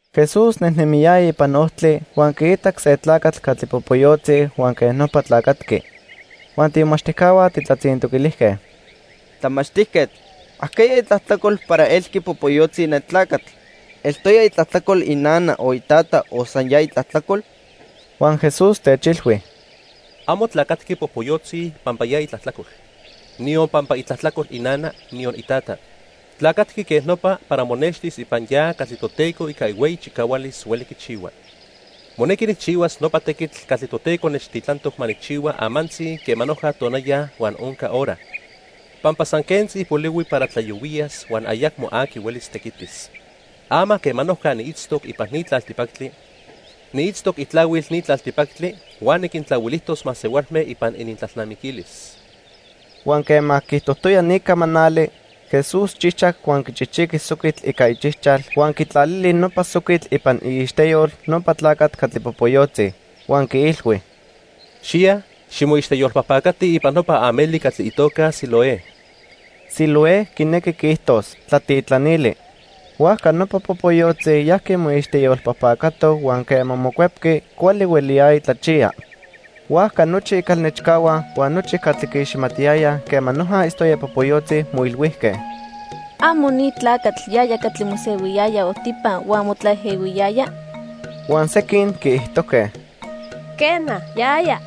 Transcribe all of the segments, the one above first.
Jesús nejnemiyaya ipan ojtli, huan quiitac se tlacatl catli popoyotzi huan quej nopa tlacatqui. Huan tiimomachtijcahua tijtlatzintoquilijque: —Tlamachtijquetl, ¿ajqueya itlajtlacol para elqui popoyotzi ne tlacatl? ¿Eltoya itlajtlacol inana o itata o san ya itlajtlacol? Huan Jesús techilhui: —Amo tlacatqui popoyotzi pampa ya itlajtlacol, niyon pampa itlajtlacol inana, niyon itata. Tlacatqui quej nopa para monextis ipan ya catli Toteco ica ihueyi chicahualis hueli quichihua. Monequi nijchihuas nopa tequitl catli Toteco nechtitlantoc ma nijchihua amantzi quema noja tonaya huan onca hora, pampa san quentzi polihui para tlayohuiyas huan ayacmo aqui hueli tequitis. Ama quema noja niitztoc ipan ni tlaltipactli, niitztoc itlahuil ni tlaltipactli huan niquintlahuilijtos masehualme ipan inintlalnamiquilis. Huan quema quiijtojtoya ni camanali, Jesús chijchac huan quichijqui soquitl ica ichijchal huan quitlalili nopa soquitl ipan iixteyol nopa tlacatl catli popoyotzi. Huan quiilhui: —Xiya, ximoixteyolpajpacati ipan nopa ameli catli itoca Siloé. (Siloé quinequi quiijtos: Tlatitlanili.) Huajca nopa popoyotzi yajqui moixteyolpajpacato huan quema mocuepqui, cuali hueliyaya tlachiya. Huajca nochi icalnechcahua huan nochi catli quiiximatiyayaj quema noja itztoya popoyotzi moilhuijque: —¿Amo ni tlacatl yaya catli mosehuiyaya ojtipa huan motlaejehuiyaya? Huan sequin quiijtojque: —Quena, yaya.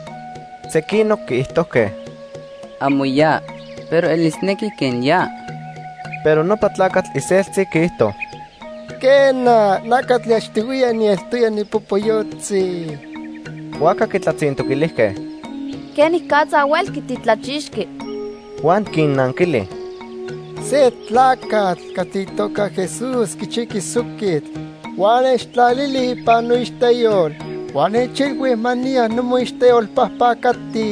Sequinoc quiijtojque: —Amo ya, pero elisnequi quen ya. Pero nopa tlacatl iseltzi quiijto: —Quena, na catli achtihuiya nieltoya nipopoyotzi. Huajca quitlatzintoquilijque: —¿Quenicatza huelqui titlachixqui? Huan quinnanquili: —Se tlacatl catli itoca Jesús quichijqui soquitl, huan nechtlalili ipan noixteyol huan nechilhui ma niya nimoixteyolpajpacati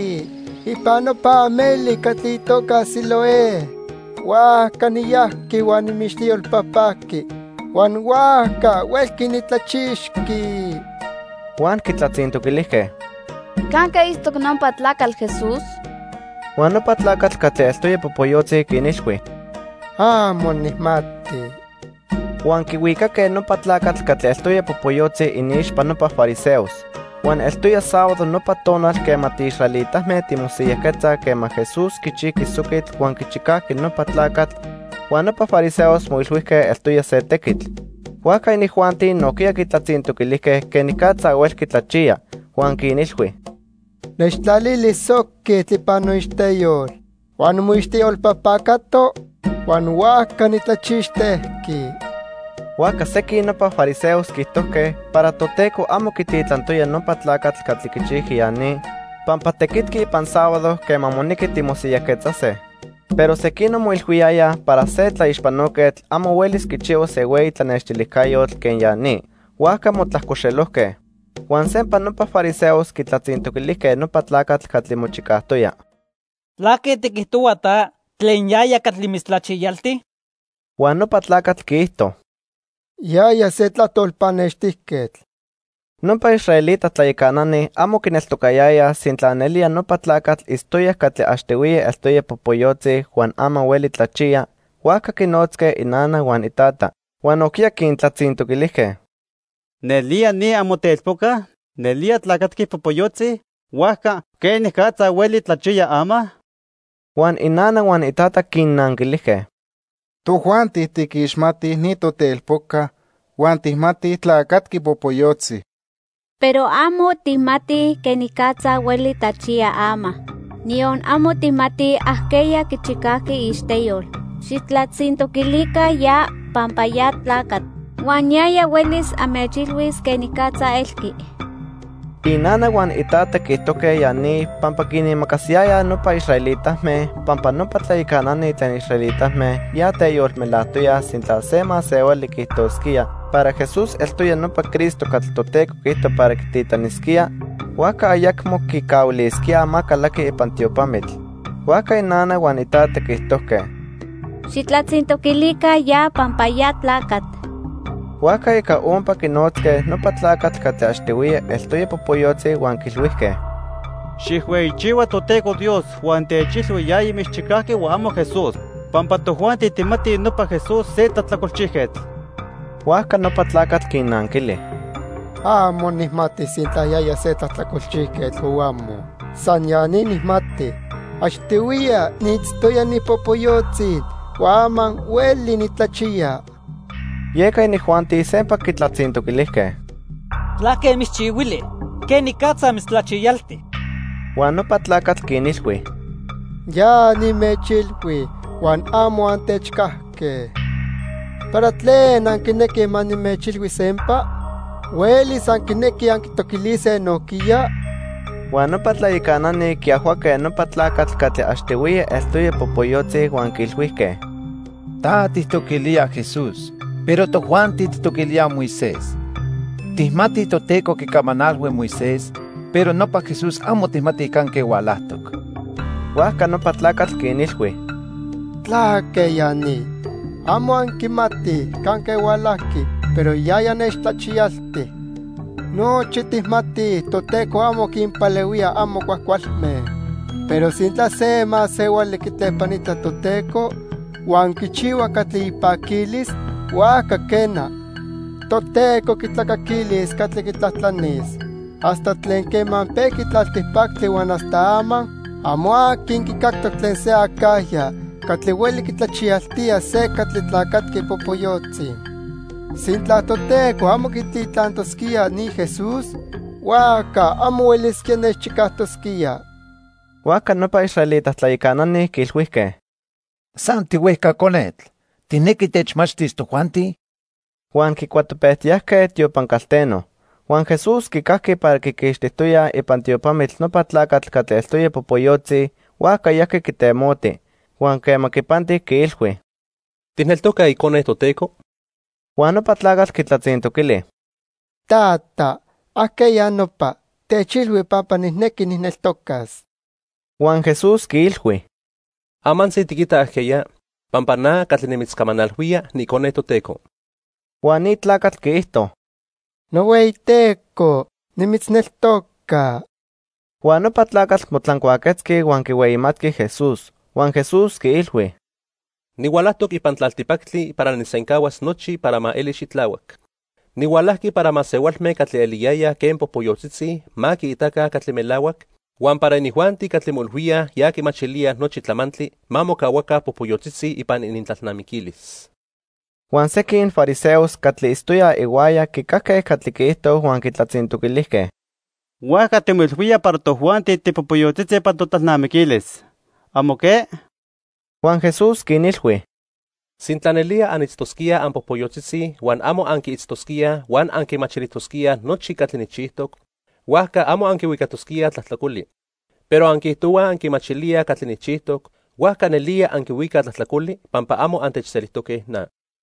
ipan nopa ameli catli itoca Siloé. Huajca niyajqui huan nimoixteyolpajpajqui huan huajca huelqui nitlachixqui. Huan quitlatzintoquilijque: —¿Canque itztoc nopa tlacatl Jesús? Huan nopa tlacatl catli eltoya popoyotzi quinilhui: —Amo nijmati. Huan quihuicaque nopa tlacatl catli eltoya popoyotzi iniixpa nopa fariseos. Huan eltoya sábado nopa tonal quema tiisraelitame timosiyajquetzaj quema Jesús quichijqui soquitl huan quichicajqui nopa tlacatl, huan nopa fariseos moilhuijque eltoya se tequitl. Huajca inijuanti nojquiya quitlatzintoquilijque quenicatza huelqui tlachiya. Huan quinilhui: —Nechtlalili soquitl ipan noixteyol huan nimoixteyolpajpacato, huan huajca nitlachixtejqui. Huajca sequin nopa fariseos quiijtojque para Toteco amo quititlantoya nopa tlacatl catli quichijqui ya ni, pampa tequitqui ipan sábado quema monequi timosiyajquetzase. Pero sequinoc moilhuiyayaj para se tlaixpanoquetl amo huelis quichihuas se hueyi tlanextilijcayotl quen ya ni. Huajca motlajcoxelojque. Huan sempa nopa fariseos quitlatzintoquilijque nopa tlacatl catli mochicajtoya: —¿Tlaque tiquijtohua ta tlen yaya catli mitztlachiyalti? Huan nopa tlacatl quiijto: —Yaya se tlajtol pannextijquetl. Nopa israelita tlayacanani amo quineltocayayaj sintla nelía nopa tlacatl itztoya catli achtihuiya eltoya popoyotzi huan ama hueli tlachiya, huajca quinnotzque inana huan itata. Huan nojquiya quintlatzintoquilijque: —¿Nelía, ni amotelpoca? ¿Nelía tlacatqui popoyotzi? Huajca, ¿quenicatza hueli tlachiya ama? Huan inana huan itata quinnanquilijque: —Tojuanti tiquiximatij ni totelpoca huan tijmatij tlacatqui popoyotzi. Pero amo tijmatij quenicatza hueli tlachiya ama, niyon amo tijmatij ajqueya quichicajqui iixteyol. Xijtlatzintoquilica ya, pampa ya tlacatl huan yaya huelis anmechilhuis quenicatza elqui. Inana huan itata quiijtojque ya ni pampa quinimacasiyayaj nopa israelitame, pampa nopa tlayacanani tlen israelitame ya teyolmelajtoyaj sintla se masehuali quiijtosquía para Jesús eltoya nopa Cristo catli Toteco quiijto para quititlanisquía, huajca ayacmo quicahuilisquíaj ma calaqui ipan tiopamitl. Huajca inana huan itata quiijtojque: —Xijtlatzintoquilica ya, pampa ya tlacatl. Huajca ica ompa quinotzque nopa tlacatl catli achtihuiya eltoya popoyotzi huan quiilhuijque: —Xijhueyichihua Toteco Dios huan techilhui yaya mitzchicajqui huan amo Jesús, pampa tojuanti tijmatij nopa Jesús se tlajtlacolchijquetl. Huajca nopa tlacatl quinnanquili: —Amo nijmati sintla yaya se tlajtlacolchijquetl o amo. San ya ni nijmati. Achtihuiya niitztoya nipopoyotzi huan ama hueli nitlachiya. Yeca inijuanti sempa quitlatzintoquilijque: —¿Tlaque mitzchihuili? ¿Quenicatza mitztlachiyalti? Huan nopa tlacatl quinilhui: —Ya nimechilhui huan amo antechcajque. ¿Para tlen anquinequij ma nimechilhui sempa? ¿Huelis anquinequij anquitoquilise nojquiya? Huan nopa tlayacanani quiajhuaque nopa tlacatl catli achtihuiya eltoya popoyotzi huan quiilhuijque: —Ta tijtoquilía Jesús, pero tojuanti tijtoquilíaj Moisés. Tijmatij Toteco quicamanalhui Moisés, pero nopa Jesús amo tijmatij canque hualajtoc. Huajca nopa tlacatl quinilhui: —¿Tlaque ya ni? Amo anquimatij canque hualajqui, pero yaya nechtlachiyalti. Nochi tijmatij Toteco amo quinpalehuía amo cuajcualme. Pero sintla se masehuali quitlepanita Toteco huan quichihua catli ipaquilis, huajca quena, Toteco quitlacaquilis catli quitlajtlanis. Hasta tlen quema pejqui tlaltipactli huan hasta ama, amo aqui quicactoc tlen se acajya catli hueli quitlachiyaltía se catli tlacatqui popoyotzi. Sintla Toteco amo quititlantosquía ni Jesús, huajca amo huelisquía nechchicajtosquía. Huajca nopa israelita tlayacanani quiilhuijque: —¡San tihuejca conetl! ¿Tijnequi techmachtis tojuanti? Huan quicuatopejtiyajque tiopan calteno. Huan Jesús quicajqui para quiquixtijtoyaj ipan tiopamitl nopa tlacatl catli eltoya popoyotzi, huajca yajqui quitemoti. Huan quema quipanti, quiilhui: —¿Tijneltoca Icone Toteco? Huan nopa tlacatl quitlatzintoquili: —Tata, ¿ajqueya nopa? Techilhui pampa nijnequi nijneltocas. Huan Jesús quiilhui: —Amantzi tiquita ajqueya, pampa na catli nimitzcamanalhuía, niIcone Toteco. Huan ni tlacatl quiijto: —NohueyiTeco, nimitzneltoca. Huan nopa tlacatl motlancuaquetzqui huan quihueyimatqui Jesús. Huan Jesús quiilhui: —Nihualajtoc ipan tlaltipactli para nijsencahuas nochi para ma eli xitlahuac. Nihualajqui para masehualme catli eliyayaj quen popoyotzitzi ma quiitaca catli melahuac, huan para inijuanti catli moilhuíaj ya quimachilíaj nochi tlamantli ma mocahuaca popoyotzitzi ipan inintlalnamiquilis. Huan sequin fariseos catli itztoyaj ihuaya quicajque catli quiijto huan quitlatzintoquilijque: —Huajca timoilhuía para tojuanti tipopoyotzitzi ipan totlalnamiquilis. ¿Amo que? Huan Jesús quinilhui: —Sintla nelía anitztosquíaj anpopoyotzitzi huan amo anquiitztosquíaj huan anquimachilijtosquíaj nochi catli nijchijtoc, huajca amo anquihuicatosquíaj tlajtlacoli. Pero anquiijtohuaj anquimachilíaj catli nijchijtoc, huajca nelía anquihuicaj tlajtlacoli pampa amo antechselijtoque na.